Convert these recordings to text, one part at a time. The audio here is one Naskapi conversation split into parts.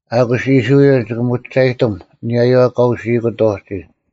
ᐊᑯᔅ ᐃᔅᕋᐃᓪ ᒋᑭ ᒧᒋᒐᔨᑎᒻ ᐊᓂᔭᔪᐛ ᑲ ᐅᓯᐃᑯᑦ ᐅᒋ: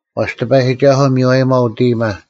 ᐛᔅ ᑎᐸᔨᒋᒐᓱᐤ ᒥᔽᔨᒪᐤ ᐅᑦ ᐃᔨᒪ: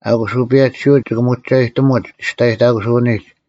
ᐊᑯᔅ ᐅᐸᔭᒋᓯᐅᒡ ᒋᑭ ᒧᒋᒐᔨᑎᒧᒡ ᒋᔅᑕᔨᑕᑯᓱᐅᓂᒡ: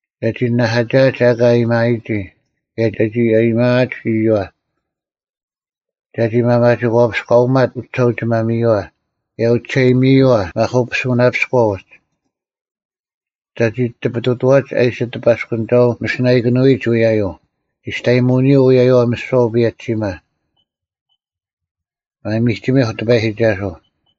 ᒐᒋ ᓇᓇᐧᑲᒋᐊᒡ ᐊᑲ ᐊᔭᒥᐊᔨᒋ, ᑭᔭ ᒐᒋ ᐊᔨᒥᐊᒡ ᐃᔪᐛ; ᒐᒋ ᒪᒪᒋᒂᐱᔎᐅᒪᑦ ᐅᒋᓴᐅᒋᒪᒥᔪᐛ, ᑭᔭ ᐅᒋᓴᐃᔨᒥᔪᐛ ᒪᑯᐱᓱᓇᐱᔎ ᐅᒡ; ᒐᒋ ᑎᐱᑐᑐᐛᒡ ᐊ ᐃᓯ ᑎᐸᔅᑯᓂᒐᐤ ᒥᓯᓇᐃᑭᓄᐎᔨᒡ ᐅᔭᔪᐤ, ᒋᔅᑕᔨᒧᐅᓂᔪᐤ ᐅᔭᔪᐛ ᒥᓯᐛ ᐅᐸᔭᒋᓯᒪ᙮ ᒪᒥᒋᒥᐧᒄ ᑎᐸᔨᒋᒐᓱᐤ!